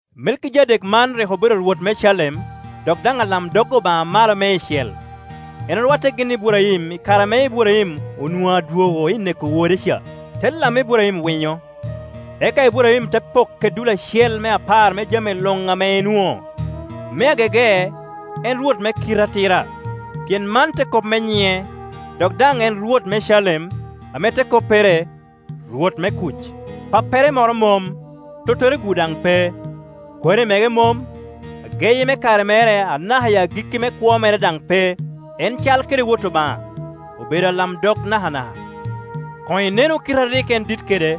Melkijadek man rik obedo rwot me Calem, dok daŋ alamdog Obaŋa Amalo Meicel. En orwatte gin i Iburaim i kare ame Iburaim onwoŋo adwogo i neko rwode ca, te lammi Iburaim winyo; eka Iburaim te pokke dul acel me apar me jami luŋ ame enwoŋo. Me agege en “rwot me kite atira”, pien man te kop me nyiŋe, dok daŋ en rwot me Calem, ame te koppere, “rwot me kuc”. Pappere moro mom, tottere-gu daŋ pe, kwari mege mom, ageyi me kare mere, anaka agikki me kwo mere daŋ pe. En cal kede Wot Obaŋa, obedo alamdog nakanaka. Koŋ inenu kite a rik en dit kede!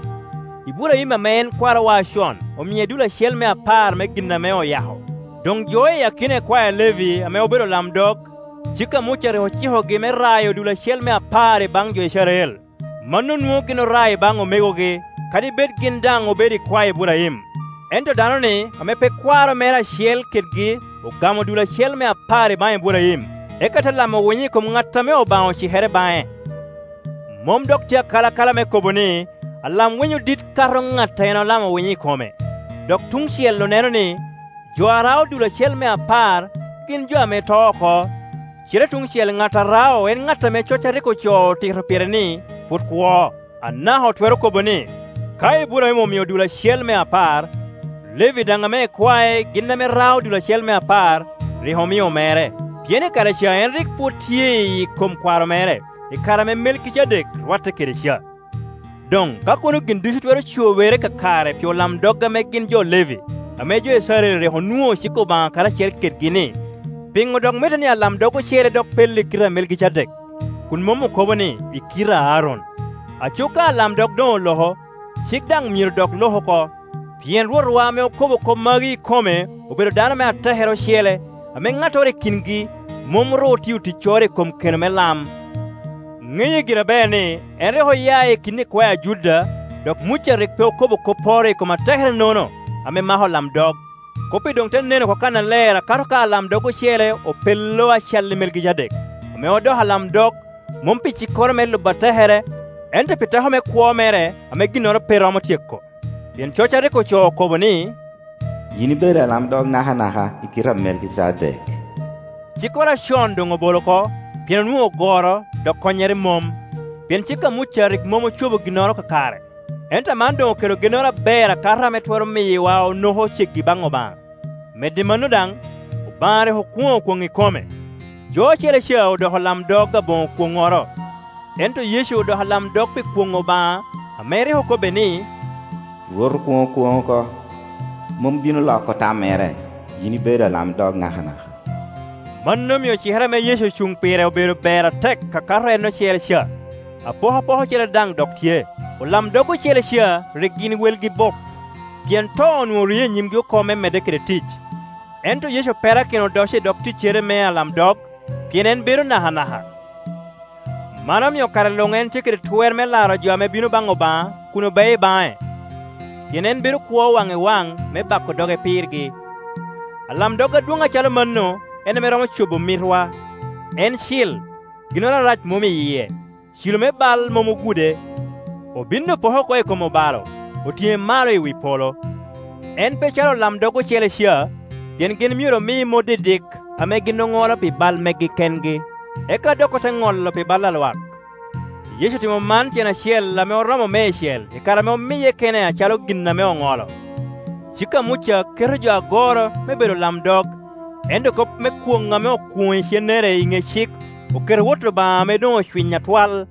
Iburaim ame en kwarowa acon omie dul acel me apar me gin ame oyako. Doŋ jo i akina ikwae a Levi ame obedo olamdog, cik a Muca rik ocikogi me rayo dul acel me apar i baŋ jo Icrael. Mano nwoŋo gin orao i baŋ omegogi, kadi bed gin daŋ obedo ikwae Iburaim. Ento dano-ni ame pe kwaro mere acel kedgi ogamo dul acel me apar i baŋ Iburaim, eka te lamo winyo i kom ŋat ame Obaŋa ocikere baŋe. Mom dok tye akalakala me kobo ni, alam-winyo dit kato ŋat a en olamo winyo i kome. Dok tuŋ cel oneno ni, jo a rao dul acel me apar gin jo ame to oko, cite tuŋ cel ŋat a rao en ŋat ame coc a rik ocoo otito pire ni pwod kwo. Anaka otwero kobo ni, ka Iburaim omio dul acel me apar, Levi daŋ ame ikwae gin ame rao dul acel me apar, rik omio mere, pien i kare ca en rik pwod tye iyi kom kwaro mere, i kare ame Melkijadek rwatte kede ca. Doŋ ka kono gin ducu twero cobere kakare pi olamdog ame gin jo Levi, ame jo Icrael rik onwoŋo cik Obaŋa karacel kedgi-ni, piŋo dok mitte ni alamdog ocele dok pello i kite a Melkijadek, kun mom okobo ni, i kite a Aron? Aco ka alamdog doŋ olo ko, cik daŋ myero dok lok oko. Pien Rwotwa ame okobo kop magi i kome obedo dano me atekere ocele, ame ŋattoro i kingi mom ru otio ticcoro i kom keno me lam. Ŋeye gire aber ni, en rik oya i kin ikwae a Juda, dok Muca rik pe okobo kopporo i kom atekere-nono ame mako olamdog. Kop-pi doŋ te nen oko kannaler akato ka alamdog ocele opello a calli Melkijadek, ame odoko alamdog, mom pi cikkoro ame lubo atekere, ento pi teko me kwo mere ame ginnoro pe romo tyeko. Pien cok a rik ocoo okobo ni, “Yin ibedo alamdog nakanaka, i kite a Melkijadek.” Cikkoro acon doŋ obolo oko, pien onwoŋo goro, dok konnyere mom, pien cik a Muca rik mom ocobo ginnoro kakare, ento aman doŋ okelo gennoro aber akato ame twero miyowa onoko ceggi baŋ Obaŋa. Medo i mano daŋ, Obaŋa rik okwoŋo kwoŋ i kome. Jo ocele ca odoko olamdog aboŋo kwoŋŋoro, ento Yecu odoko alamdog pi kwoŋ Obaŋa ame rik okobbe ni, “Rwot okwoŋo kwoŋ oko, mom bino loko tammere, ‘Yin ibedo alamdog nakanaka.’” Mano omio cikere ame Yecu ocuŋ pire obedo ber atek akato en ocele ca. Apokapoka ocele daŋ dok tye. Olamdog ocele ca rik gin welgi bup, pien to onwoŋo oriye i nyimgi oko me medde kede tic, ento Yecu perakino odoco i dog ticcere me alamdog, pien en bedo nakanaka. Man omio kare luŋ en tye kede twer me laro jo ame bino baŋ Obaŋa kun obeo baŋe, pien en bedo kwo waŋ i waŋ me bako doge pirgi. Alamdog adwoŋ acalo mano en ame romo cobo mitwa. En cil, ginnoro arac mom i yie, cilo me bal mom ogude. Obin opoke oko i kom obalo, otiŋe malo i wi polo. En pe calo olamdog ocele ca, pien gin myero omi mot didik ame gin oŋolo pi bal megi kengi, eka dok ote ŋolo pi bal a lwak. Yecu otimo man tyen acel ame oromo meicel i kare ame omiye kene acalo gin ame oŋolo Cik a Muca keto jo agoro me bedo olamdog, ento kop me kwoŋ ame okwoŋo icennere i ŋe cik oketo Wot Obaŋa ame doŋ ocwiny atwal.